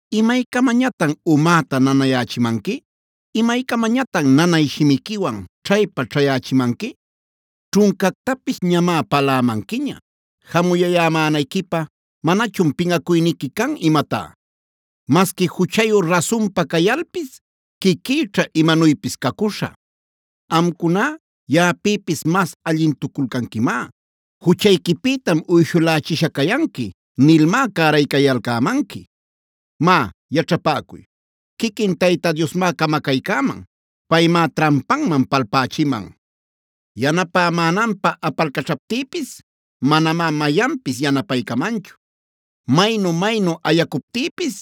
“¿Imaycamañatan umäta nanayächimanqui? ¿Imaycamañatan nanay shimiquiwan ćhaypa-ćhayächimanqui? Ćhuncactapis ñamá palämanquiña; jamuyayämänayquipä ¿manañachun pinꞌacuyniqui can imatá? Masqui juchayu rasunpa cayalpis quiquïćha imanuypis cacuśhä. Amcuná yaꞌapïpis mas allintuculcanquimá. ‘Juchayquipïtam uyshulächisha cayanqui’ nilmá caraycayalcämanqui. Má yaćhapäcuy, quiquin Tayta Diosmá camacaycäman. Paymá trampanman palpächiman. “Yanapämänanpä apalcaćhaptïpis manamá mayanpis yanapaycamanchu. Maynu-maynu ayacuptïpis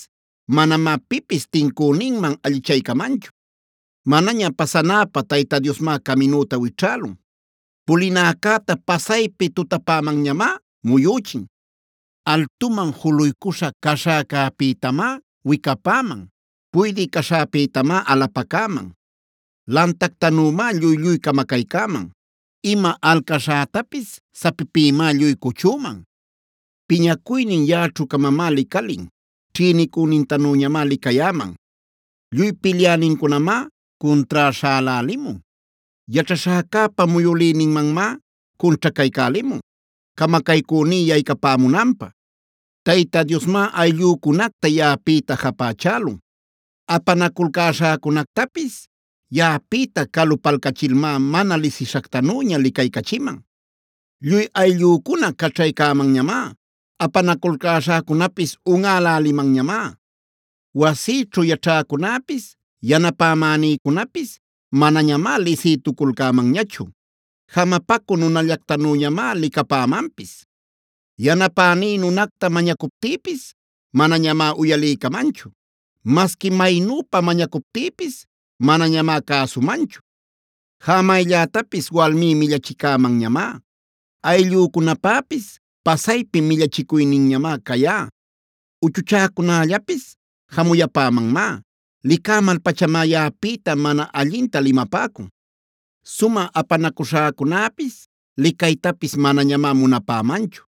manamá pipis tincüninman allichaycamanchu. Manaña pasanäpä Tayta Diosmá caminüta wićhälun. Pulinäcäta pasaypi tutapämanñamá muyüchin. Altuman juluycuśha caśhäcäpïtamá wicapäman; puydï caśhäcäpïtamá alapacäman. Lantactanümá lluy-lluy camacaycäman; ima alcaśhätapis sapipïmá lluy cuchüman. Piñacuynin yaꞌaćhu-camamá licalin. Ćhïnicünintanüñamá licayäman. Lluy pilyänincunamá cuntrá śhälälimun. Yaćhaśhäcäpa muyülïnïmanmá cunćhacaycälimun, camacaycüní yaycapämunanpä. “Tayta Diosmá ayllücunacta yaꞌapïta japächälun.a Apanaculcäśhäcunactapis yaꞌapïta calupalcachilmá, mana lisishactanüña licaycachiman. Lluy ayllücuna caćhaycämanñamá. Apanaculcäśhäcunapis unꞌälälimanñamá. Wasïćhu yaćhäcunäpis, yanapämänïcunapis manañamá lisïtuculcämanñachu. Jamapacü nunallactanüñamá licapämanpis. Yanapäní nunacta mañacuptïpis manañamá uyaliycamanchu; masqui maynüpa mañacuptïpis manañamá cäsumanchu. Jamayllätapis walmí millachicamanñamá; ayllücunapäpis pasaypi millachicuyninñamá cayá. Uchuchäcunällapis jamuyapämanmá; licämal-pachamá yaꞌapïta mana allinta limapäcun. Sumä apanacüśhäcunäpis licaytapis manañamá munapämanchu;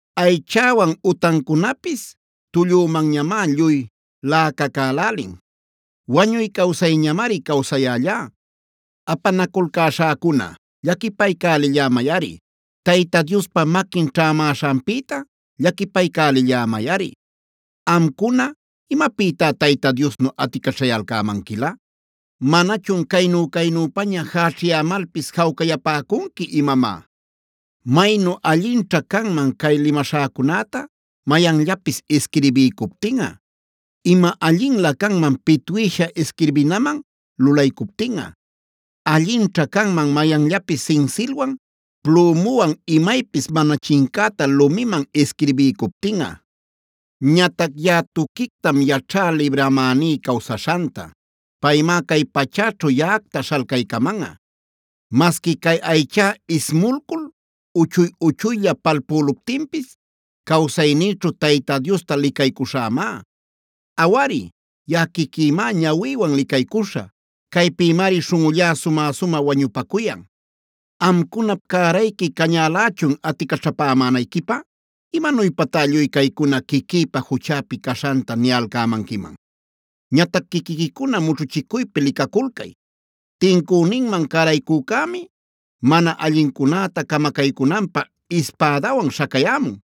Aychäwan utancunapis tullümanñamá lluy laꞌacacälälin; wañuy-cawsayñamari cawsayällá. Apanaculcäśhäcuna, llaquipaycälillämayꞌari. Tayta Diospa maquin ćhämäśhanpïta llaquipaycälillämayꞌari. Amcuna, ¿imapïtá Tayta Diosnu aticaćhayalcämanquilä? ¿Manañachun caynu-caynüpaña jächiyalcämalpis jawcayapäcunqui imamá? “Maynu allinćha canman cay limaśhäcunäta mayanllapis isquirbiycuptinꞌa. Ima allinlä canman pitwïsha isquirbinaman lulaycuptinꞌa. Allinćha canman mayanllapis sinsilwan, plümuwan imaypis mana chincäta lumiman isquirbiycuptinꞌa. Ñatac yaꞌa tuquictam yaćhá libramäní cawsaśhanta. Paymá cay pachäćhu yaꞌacta śhalcaycamanꞌa. Masqui cay aychá ismulcul uchuy-uchuylla palpüluptinpis, cawsaynïćhu Tayta Diosta licaycuśhämá. Awari, yaꞌa quiquïmá ñawïwan licaycuśhä,c Caypïmari śhunꞌullá sumä-sumä wañupacuyan. “¡Amcunap cärayqui cañälächun aticaćhapämänayquipä! ¡Imanuypatá lluy caycuna quiquïpa juchäpi caśhanta niyalcämanquiman! Ñatac quiquiquicuna mućhuchicuypi licaculcay. Tincüninman cäraycücämi mana allincunäta camacaycunanpä ispädawan śhacayämun.